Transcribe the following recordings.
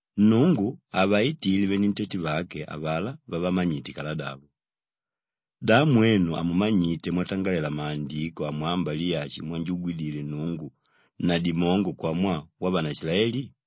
Nnungu havaitile venentete vake avalá vavamanyite kaladavo. Da mwenu hamumanyite mwatangalela Maandiko amwámba Liyashi mwanjugwidile Nnungu na dimongo kwamwaa wavanaishilaeli?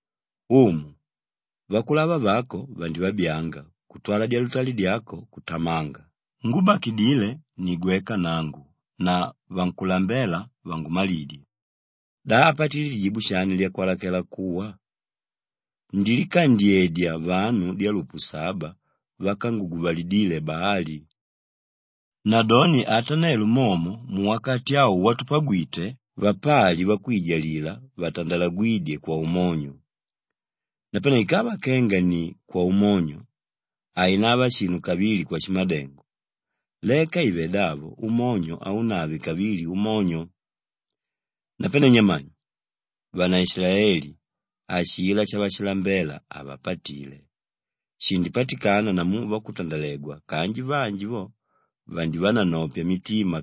Umu, vakulava vako vandivabyanga kutwala dyalutali dyako kutamanga, ngúbakidile ni gweka nangu na vankulambela vangumalidye.” Da apatile lijibu shani lyakwalakela kuwa? “Ndilikandyedya vanu dyalupu saba vákanguguvalidile Baali.” Nadoni ata nelo momo muwakati au watupagwite, vapali vakwijalila vatandalagwídye kwaumonyo. Napane ikava kenga ni kwaumonyo, hainava shinu kavili kwashimadengo, leka ive davo umonyo haunave kavili umonyo. Napane nyamani? Vanaishilaeli, ashilá shavashilambela havapatile. Shindipatikana namu vakutandalegwa kanji vanji vo vandivananopya mitima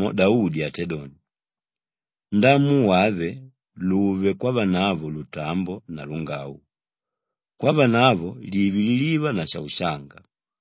Namomo Daudi atédoni, “Ndamu wave luve kwavanavo lutambo na lungau kwavanavo live liliva na shaushanga.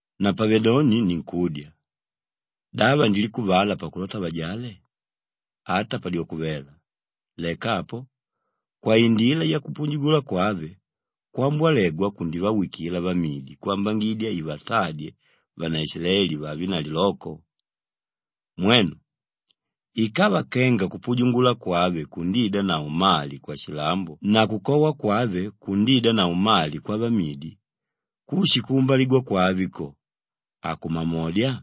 Napavedoni ninkudya, da vandilikuvala pakulota vajale? Ata padyoko vela! Leka apo, kwaindila yakupujungula kwave kwambolegwa kundivawikila vamidi kwambangidya ivatadye vanaishilaeli vavenavo liloko. Mwenu, ikava kenga kupujungula kwave kundiidanavo mali kwashilambo na kukowa kwave kundiidanavo mali kwavamidi, kushi kuumbaligwa kwave ko, akumamodya?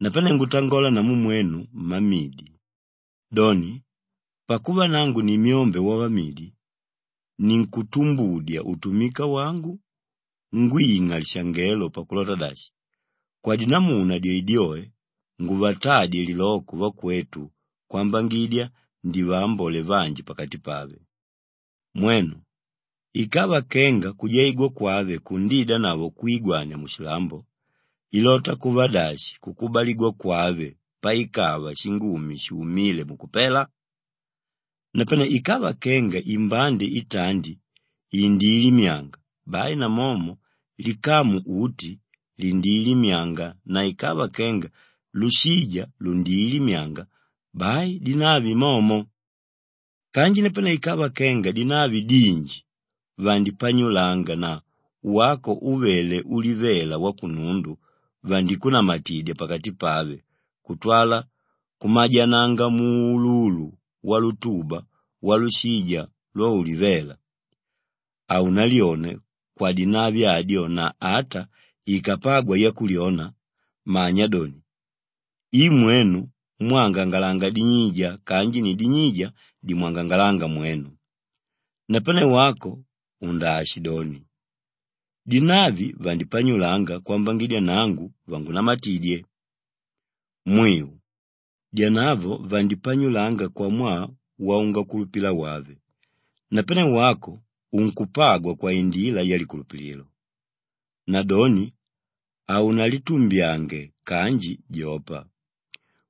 Napane ngutangola namu mwenu mmamidi. Doni, pakuva nangu ni myombe wavamidi ninkutumbudya utumika wangu ngwing'a lishangelo pakulota dashi, kwadinamuna dyoedyoe nguvatadye liloko vakwetu kwambangidya ndivaambole vanji pakati pave. Mwenu, ikava kenga kujaigwa kwave kundiidanavo kwigwania mushilambo, ilota kuva dashi kukubaligwa kwave paikava shingumi shuumíle mukupela? Napane ikava kenga imbande itandi indiilimyanga bai namomo likamu uti lindiilimyanga na ikava kenga lushija lundiilimyanga bai dinavi momo. Kanji napane ikava kenga dinavi dinji vandipanyulanga na wako úvele ulivela wakunundu vandikunamatidya pakati pave kutwala kumajananga muululu walutuba walushija lwaulivela, haunalyone kwadinavi adyo na ata ikapagwa yakulyona, manya doni, i mwenu mwángangalanga dinyija kanji ni dinyija dímwangangalanga mwenu. Napane wako undaashidoni, “Dinavi vandipanyulanga kwambangidya nangu vangunamatidye.” Mwiu. Dyanavo vandipanyulanga kwamwaa waungakulupila wave, napane wako unkupagwa kwaindila yalikulupililo. Nadoni haunalitumbyange kanji jopa.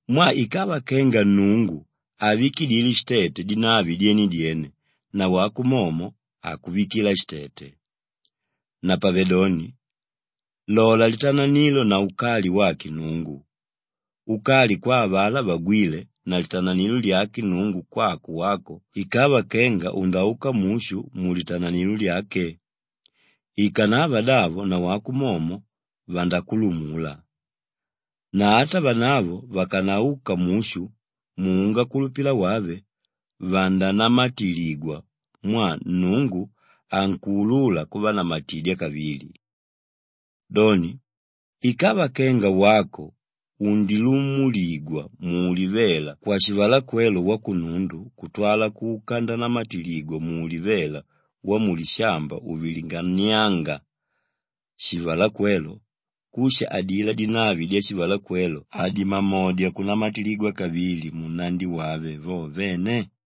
Mwaa ikava kenga Nnungu havikidile shitete dinavi dyene-dyene nawako momo hakuvikila shitete. Napavedoni, lola litananilo na ukali wake Nnungu: ukali kwa avalá vagwíle na litananilo lyake Nnungu kwako wako ikava kenga undauka mushu mulitananilo lyake; ikanavadavo, nawako momo vandakulumula. Na ata vanavo vakanauka mushu muungakulupila wave, vandanamatiligwa mwaa Nnungu ankuulula kuvanamatidya kavili. Doni, ikava kenga wako undilumuligwa muulivela kwashivalakwelo wakunundu kutwala kuka ndanamatiligwa muulivela wamulishamba uvilinganiánga shivalakwelo, kushi adilá dinavi dyashivalakwelo hadimamodya kunamatiligwa kavili munnandi wave vo vene?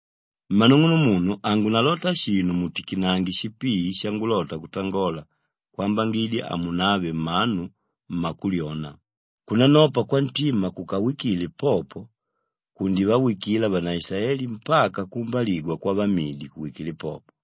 Mmanung'unumunu hangunalota shinu mutikinange shipii shangulota kutangola kwambangidya hamunave mmanu mmakulyona: kunanopa kwantima kúkawikidile popo kundivawikila vanaishilaeli mpaka kuumbaligwa kwavamidi kuwikile popo.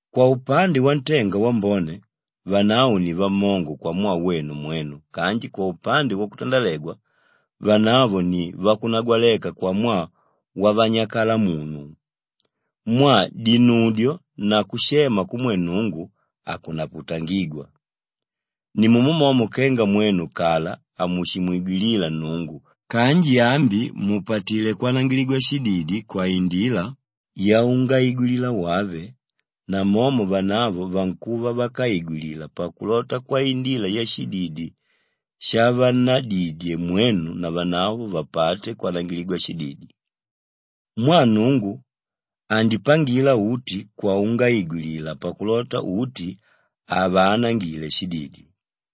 Kwaupande wantenga wambone, vanavo ni vamongo kwamwaa wenu mwenu kanji kwaupande wakutandalegwa, vanavo ni vakunagwaleka kwamwaa wavanyakalamunu. Mwaa dinudyo na kushema kumwe Nnungu, hakunaputangigwa. Nimumo momo kenga mwenu kala hamushimwigwilila Nnungu kanji ambi mupatilé kwanangiligwa shididi kwaindila yaungaigwilila wave namomo vanavo vankuva vákaigwilila pakulota kwaindila yashididi shavannadidye mwenu navanavo vapate kwanangiligwa shididi. Mwaa Nnungu andipangila uti kwaungaigwilila pakulota uti avaanangile shididi.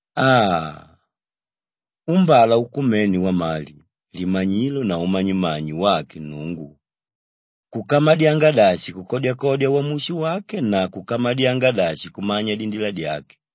Aa, umbala ukumene wamali, limanyilo na umanyimanyi wake Nnungu! Kukamadyanga dashi kukodyakodya wamushi wake na kukamadyanga dashi kumanya dindila dyake!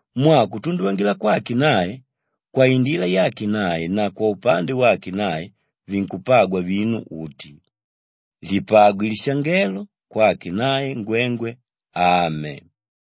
Mwaa kutunduvangila kwake nae, kwaindila yake nae na kwaupande wake nae vinkupagwa vinu uti. Lipagwe lishangelo kwake nae ngwengwe. Ame.